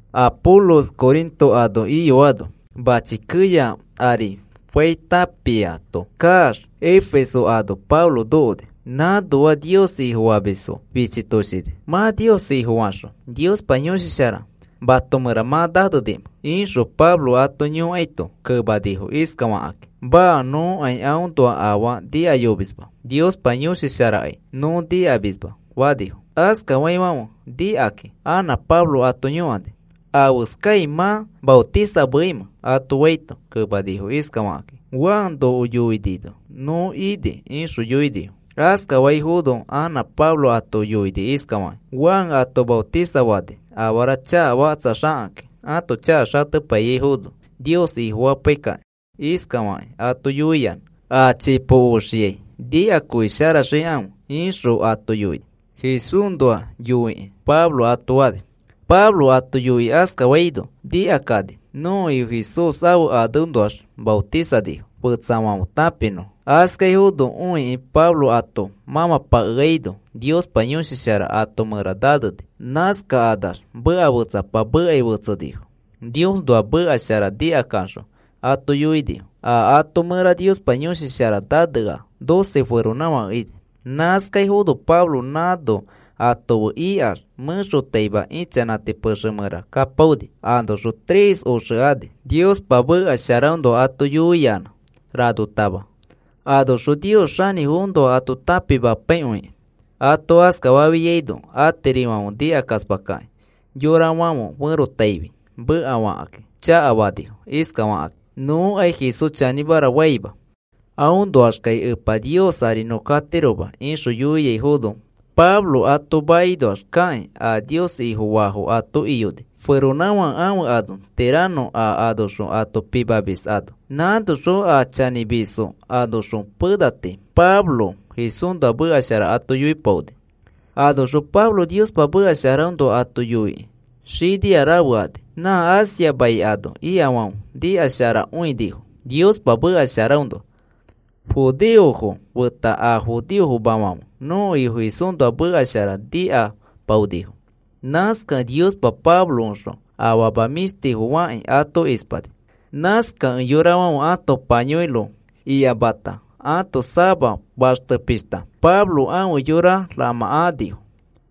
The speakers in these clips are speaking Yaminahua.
Apolos Corinto ano iyoano, mãchi keya ari fai tãpiato kaax Efeso ano Pablo nokoni. Nãnoa Nios Ifofamisfo fichitoshini. “¿Mã Nios Ifofaxõ Niospa Yõshi Shara mato mẽra mã nanenimẽ?” ixõ Pablo ato yõkaito, kemanifo iskafakakĩ: “Maa, nõkai aõnoa afaa nikayomisma, Niospa Yõshi Sharakai nõ nikamisma,” fanifo. Askafaifãfe nikakĩ anã Pablo ato yõkani: “¿Afeskai mã maotisanimẽ?” ato faito, kemanifo iskafakakĩ: “Juan noko yoinino nõ ini,” ixõ yoinifo. Askafaifono anã Pablo ato yoini iskafakĩ: “Juan ato maotisafani afara chakafakatsaxakakĩ ãto chaka xatepaiyaifono Nios Ifofapaikakĩ. Iskafakĩ ato yoiyanã a chipo oxiai nikakõisharaxikãfe ixõ ato yoini, Jesúsnoa yoikĩ,” ato Pablo fani. Pablo ato yoikĩ askafaino, nikakani nõko Ifo Jesús ãfe aneõnoax maotisanifo fetsafãfe tãpinõfo. Askaifono õikĩ Pablo ato mãmãpakeaino Niospa Yõshi Shara ato mẽra naneni. Nãskakanax meka fetsapa mekai fetsenifo. Niosnoa meka shara nikakaxõ ato yoinifo. A ato mẽra Niospa Yõshi Shara nanea, doce feronãfake ini. Nãskaifono Pablo nãno ato fe ikax mẽxotaima ichanãti pexe mẽra kapaoni. Anoxõ tres oxe ani. Niospa meka sharaõnoa ato yoiyanã ranotama, anoxõ Nios xanĩfoõnoa ato tãpimapaikõikĩ. Ato askafafiaino atirifãfe nikakaspakakĩ yorafãfe ferotaifi mekafakĩ chakafanifo iskafakakĩ: “Nõkai Jesús chanĩmara faima. Aõnoaxkai Epa Nios ari nõ katiroma,” ixõ yoiaifono, Pablo ato makinoax kakĩ a Nios Ifofaafo ato iyoni, feronãfake ãfe ane Tirano a anoxõ ato tãpimamis ano. Nãnoxõ a chanĩmisfo anoxõ pena tii Pablo Jesúsnoa meka shara ato yoipaoni. Anoxõ Pablo Niospa meka sharaõnoa ato yoikĩ xinia rafe ani. Nã Asia mai ano ikafãfe nikasharakõinifo Niospa meka sharaõnoa. Judeofo feta a judeofofãfema nõko Ifo Jesúsnoa meka shara nikapaonifo. Nãskakẽ Niospa Pabloõxõ afama mĩshtifo fakĩ ato ispani. Nãskakẽ yorafãfe ãto payõiro iyamata ãto sama faxte pishta Pablo ãfe yora ramãkanifo.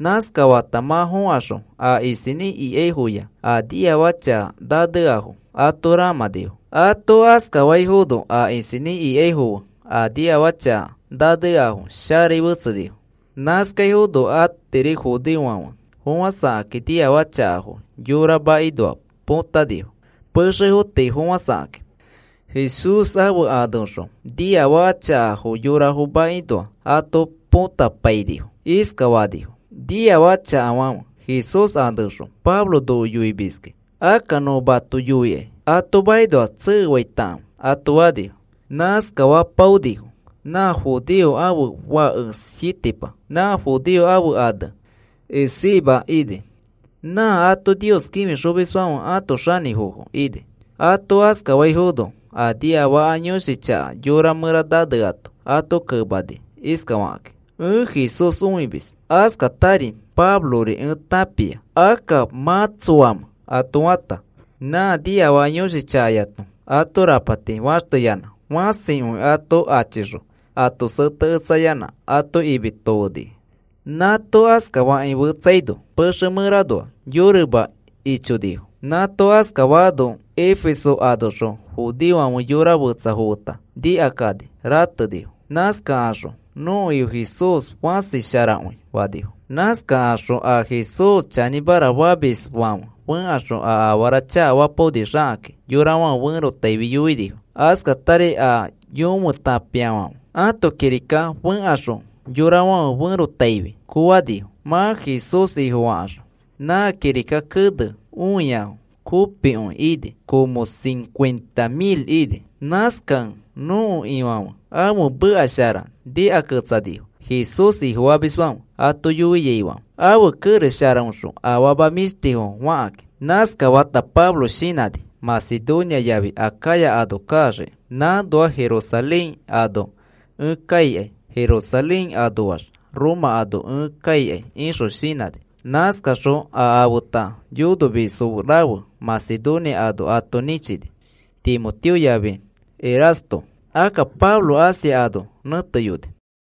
Nãskafata mã fokaxõ a isinĩ ikaifoya a niafaka chaka naneafo ato ramãnifo. Ato askafaifono a isinĩ ikaifo fe a niafaka chaka naneafo sharai fetsenifo. Nãskaifono atiri judeofãfe fofãsakakĩ niafaka chakafo yorafo makinoa põtanifo pexefo tii fofãsakakĩ. Jesús ãfe aneõxõ niafaka chakafo yorafo makinoa ato põtapainifo. Iskafanifo: “Niafaka chakafãfe, Jesús aneõxõ Pablo noko yoimiski, akka nõ mato yoikai ato makinoax tsekefaitakãfe,” ato fanifo. Nãskafapaonifo nã judeo ãfe fake sietipa, nã judeo ãfe ane Esceva ini. Nã ato Nios kĩfixomisfãfe ãto xanĩfo ini. Ato askafaifono a niafaka yõshi chaka yora mẽra naneato ato kemani iskafakĩ: “Ẽ Jesús õimis, askatari Pablori ẽ tãpia. Akka, ¿mã tsoamẽ?” ato fata, nã niafaka yõshi chakayato ato rapati faxteyanã, fãsikõi ato achixõ ato seteketsayanã ato imi tofeni. Nãato askafakĩ fetsaino pexe mẽranoax yorioma ichonifo. Nãato askafaano Efeso anoxõ judeofãfe yora fetsafo feta nikakani ratenifo. Nãskakaxõ, “Nõko Ifo Jesús fãsi sharakõi,” fanifo. Nãskakaxõ a Jesús chanĩmara famisfãfe fẽkaxõ a afara chakafapaoni xakakĩ yorafãfe ferotaifi yoinifo. Askatari a yõfe tãpiafãfe ãto kirika fẽkaxõ yorafãfe ferotaifi koanifo, mã Jesús Ifofakaxõ. Nã kirika kene õiafo kopikõi ini, como cincuenta mil ini. Nãskakẽ nõko Ifãfe ãfe mekashara nikaketsanifo Jesús Ifofamisfãfe ato yoiaifãfe, ãfe kerex sharaõxõ afama mĩshtifo fakakĩ. Nãskafata Pablo shinãni Macedonia yafi Acaya ano kaxiki. “Nãnoax Jerusalén ano ẽ kaikai, Jerusalén anoax Roma ano ẽ kaikai,” ixõ shinãni. Nãskaxõ a afeta yonomisfo rafe Macedonia ano ato nĩchini Timoteo yafi Erasto. Akka Pablo Asia ano nẽteyoni.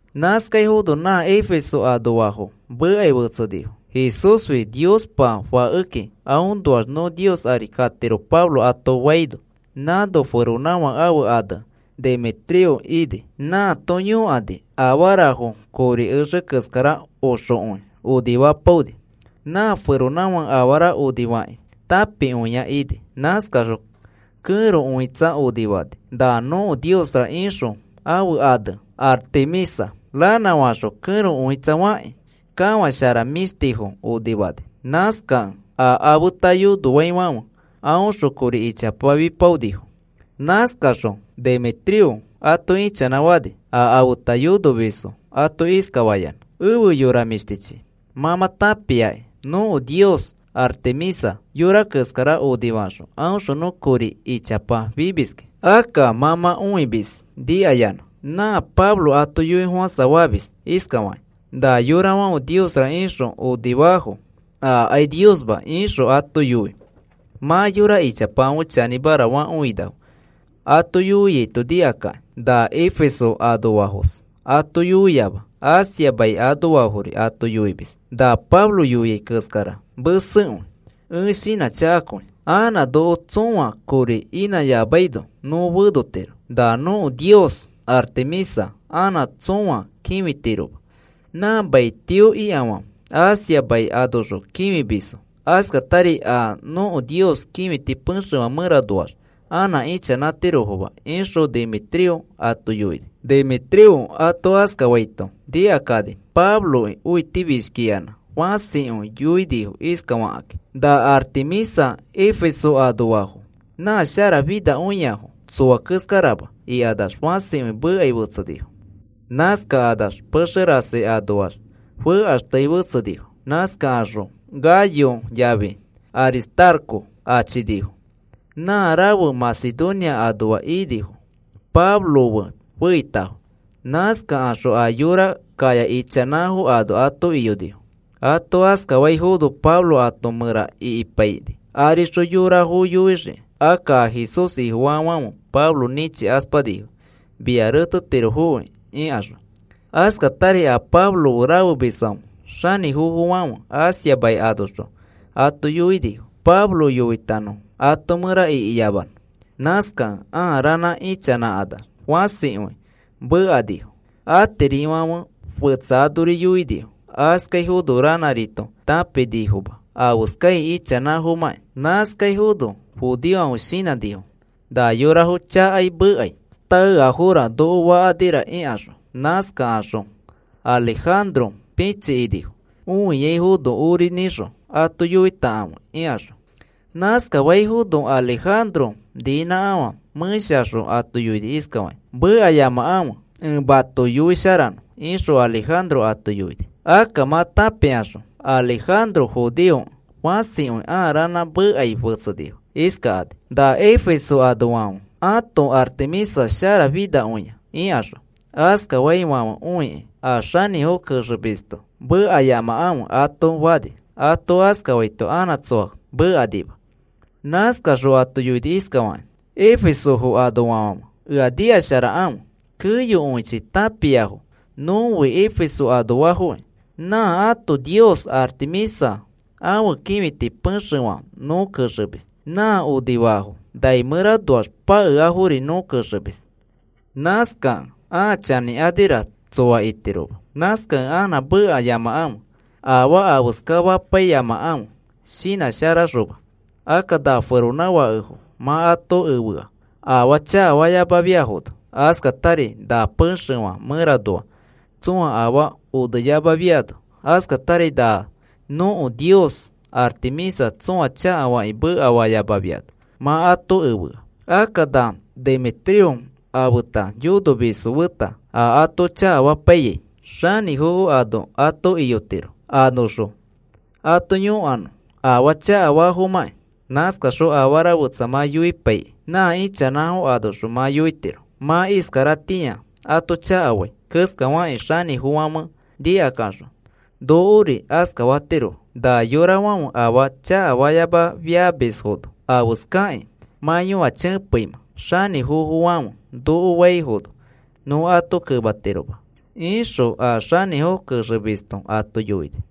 Nãskaifono nã Efeso anoafo mekai fetsenifo: “Jesúsfi Niospa Fakekĩ aõnoax nõ Nios ari katiro,” Pablo ato faino, nãno feronãfake ãfe ane Demetrio ini. Nãato yonokĩ afarafo kori exe keskara oxokõi onifapaoni. Nã feronãfãke afara onifakĩ tãpikõia ini. Nãskaxõ kẽro õitsa onifani, na nõko niosra ixõ ãfe ane Artemisa. Ranãfaxõ kẽro õitsa fakĩ kafãshara mĩshtifo onifani. Nãskakẽ a afeta yonofaifãfe aõxõ kori ichapa fipaonifo. Nãskaxõ Demetrio ato ichanãfani, a afeta yonomisfo ato iskafayanã: “Efe yora mĩshtichi, mã mã tãpiakĩ nõko nios Artemisa yora keskara onifaxõ, aõxõ nõ kori ichapa fimiski. Akka mã mã õimis nikayanã, na Pablo ato yoifofãsafamis iskafakĩ: ‘Na yorafãfe niosra ixõ onifaafo, akai niosma,’ ixõ ato yoi. Mã yora ichapafãfe chanĩmara fakõinafo ato yoiaito nikakakĩ. Na Efeso anoafos ato yoiama, Asia mai anoafori ato yoimis. Na Pablo yoiai keskara mesekõi, ẽ shinãchakakõi. Anã noko tsõa kori inãyamaino nõ fenotiro, na nõko nios Artemisa anã tsõa kĩfitiroma, nã maitio ikafãfe Asia mai anoxõ kĩfimisfo. Askatari a nõko nios kĩfiti pexefã mẽranoax anã ichanãtirofoma,” ixõ Demetrio ato yoini. Demetrio ato askafaito nikakani Pabloki õitifishkiyanã fãsikõi yoinifo iskafakakĩ: “¡Na Artemisa Efesio anoafo nã sharafinakõiafo, tsoa keskarama!” ikanax fãsikõi mekai fetsenifo. Nãskakanax pexe rasi anoax fekaxtei fetsenifo. Nãskakaxõ Gayo yafi Aristarco achinifo. Nã rafe Macedonia anoa inifo, Pablo fe feitafo. Nãskakaxõ a yora kaya ichanãfo ano ato iyonifo. Ato askafaifono Pablo ato mẽra ikipaini arixõ yorafo yoixiki. Akka a Jesús Ifofaafãfe Pablo nĩchikaspanifo, “Mia retetirofoki,” ikaxõ. Askatari a Pablo fe rafemisfãfe, xanĩfofofãfe Asia mai anoxõ ato yoinifo, Pablo yoitanõfo ato mẽra ikiyamanõ. Nãskakẽ ãa ranã ichanãkanax fãsikõi mekanifo. Atirifãfe fetsa anori yoinifo. Nãskaifono ranãrito tãpinifoma afeskai ichanãfomãkĩ. Nãskaifono judeofãfe shinãnifo, na yorafo chakai mekai taeafora noko fakanira ikaxõ. Nãskakaxõ Alejandro pĩtsikinifo õiaifono ori nĩxõ ato yoitakãfe ikaxõ. Nãskafaifono Alejandro niinãkafã mẽshaxõ ato yoini iskafakĩ: “Mekayamakãfe, ẽ mato yoisharanõ,” ixõ Alejandro ato yoini. Akka mã tãpikaxõ Alejandro judeokẽ, fãsikõi ãa ranã mekai fetsenifo, iskakani: “Na Efeso anoafãfe ãto Artemisa sharafinakõia,” ikaxõ. Askaifãfe õikĩ a xanĩfo kenexomisto, “Mekayamakãfe,” ato fani. Ato askafaito anã tsoa mekanima. Nãskaxõ ato yoini iskafakĩ: “Efesofo anoafãfe ea nikasharakãfe. Keyokõichi tãpiafo nõfi Efeso anoafokĩ, nã ãto nios Artemisa ãfe kĩfiti pexefã nõ kexemis. Nã onifafo nai mẽranoax pakeafori nõ kexemis. Nãskakẽ ãa chanĩkanira tsoa itiroma. Nãskakẽ anã mekayamakãfe, afaa afeskafapaiyamakãfe shinãsharaxoma. Akka na feronãfakefo mã ato efea afaa chakafayamafiafono, askatari na pexefã mẽranoa tsõa afaa oneyamafiano, askatari na nõko nios Artemisa tsõa chakafakĩ mekafayamafiano mã ato efea. Akka na Demetrio afeta yonomisfo feta, a ato chakafapai xanĩfofo ano ato iyotiro, anoxõ ato yõkanõ afaa chakafafomakĩ. Nãskaxõ afara fetsa mã yoipaikĩ nã ichanãfo anoxõ mã yoitiro. Mã iskaratĩa ato chakafai keskafakĩ xanĩfofofãfe nikaxõ nokori askafatirofo. Na yorafãfe afaa chakafayamafiamisfono, afeskakĩ mã yõachepeimẽ xanĩfofofãfe noko faifono nõ ato kematiroma,” ixõ a xanĩfo kenexomisto ato yoini.